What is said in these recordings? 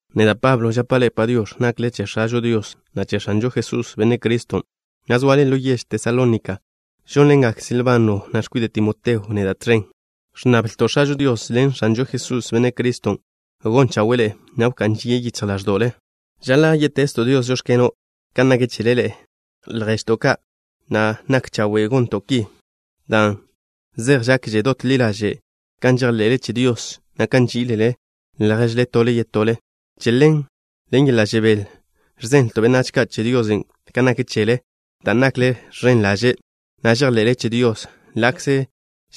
Neda', Pablo, žapa' ḻe'e “Padiox̱.” Nakle che X̱ažo Dios, na' che X̱anžo Jesús, Benne' Criston', na' zoale ḻo yež Tesalónika. Žónḻengak Silbano, na' x̱kwide' Timoteo neda' tẕen. Ẕnnablto' X̱ažo Dios ḻen X̱anžo Jesús, Benne' Criston', gon chawe'e ḻe'e, na' wká'n žie' yichj ḻáẕdo'le. Žaḻa' yé'tezto' Dios: “Žóx̱keno'” kan nak chele ḻe'e, lježto' ka', na' nak chawe' gonto' ki, dan' zej žakže dot ḻi ḻaže' kan žejḻe'le che Dios, na' kan nží'ilele lježle tole yetole. Che ḻen, ḻen yeḻa' žebél ẕzenlto' benách ka' che Diosen' kan nak chele, dan' nakle ẕen ḻaže', na' žejḻe'le che Dios ḻa'kze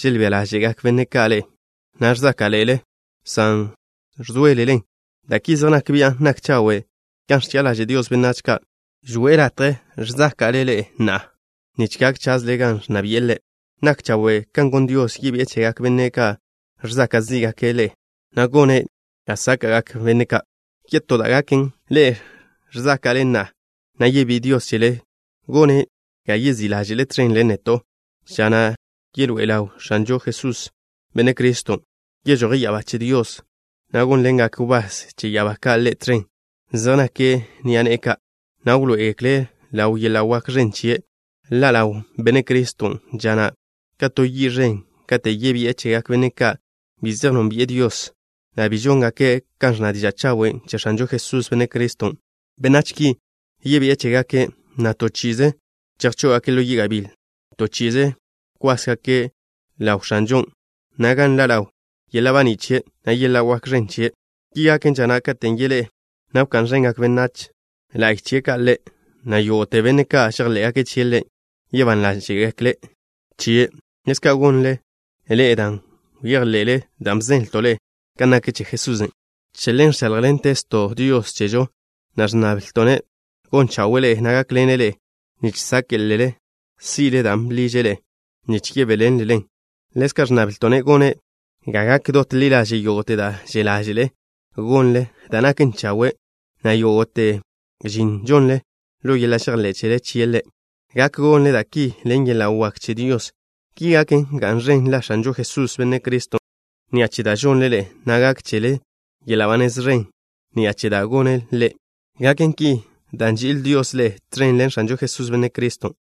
želbía ḻáže'gak benne' ka' ḻe'e, na' ẕzáka'ḻe'ele, san ẕzóelelen. Da' ki zej nak bian' nak chawe' kan ẕchi'a ḻaže' Dios benách ka'. Žwi'e latje ẕzáka'le ḻe'e na'a, nich gak chazle gan ẕnna bi'e Ḻe'. Nak chawe' kan gon Dios, yebi'e chegak benne' ka' žsaka' zí'gake' ḻe'e, na' gone' ga sáka'gak benne' ka'. Yetó da' gaken, ḻe'e ẕzáka'le na'a, na' yebí'i Dios chele, gone' ga yezí' ḻáže'le tẕen ḻen neto', ža na' yeḻoé'e ḻaw X̱anžo Jesús, Benne' Criston'. Yežoje' ya'abá che Dios, na' gónḻengak wbás che ya'abá ka' Ḻe' tẕen. Zej nake' ni'a ne'e ka', na' wḻoé'egekle' ḻaw yeḻa' wak ẕen chie'. Ḻa' ḻaw Benne' Criston' ža na' ka to yi' ẕen katen' yebi'e chegak benne' ka' bi zej nónbi'e Dios, na' bi žóngake' kan ẕnna diža' chawen' che X̱anžo Jesús, Benne' Criston'. Benách ki, yebi'e chégake', na' to chi'ize chejchó'ogake' ḻo yi' gabíl. To chi'ize kwásgake' ḻaw X̱anžon', na' gan nḻa' ḻaw yeḻa' baní' chie', na' yeḻa' wak ẕen chie'. Ki gaken ža na' katen' yeḻé'e, na' wká'n ẕengak benách la'y chie' ka' Ḻe', na' yógo'te benne' ka' žejḻé'gake' chie' Ḻe' yebán ḻáže'gekle chie'. Ḻezka' gonle ḻe'e dan' bejḻe'le da' bzenlto' ḻe'e kan nak che Jesusen'. Che ḻen ẕcháḻjḻentezto' Dios chežo, na' ẕnnablto'-ne' gon chawe'e ḻe'e, na' gákḻene' ḻe'e nich sáke'lele si'le dan' bḻiže' ḻe'e nich yebéḻenlelen. Ḻezka' ẕnnablto'-ne' gone' ga gak dot ḻi ḻaže' yógo'te da' že' ḻáže'le gonle da' naken chawe', na' yógo'te žin žonle ḻo yeḻa' žejḻé' chele chie' Ḻe'. Gak gonle da' ki ḻen yeḻa' wak che Dios. Ki gaken, ga'n ẕen la X̱anžo Jesús, Benne' Criston' ni'a che da' žonle ḻe'e, na' gak chele yeḻa' ba nez ẕen ni'a che da' gone' Ḻe'. Gaken ki dan' nži'il Dios ḻe'e tẕen ḻen X̱anžo Jesús, Benne' Criston'.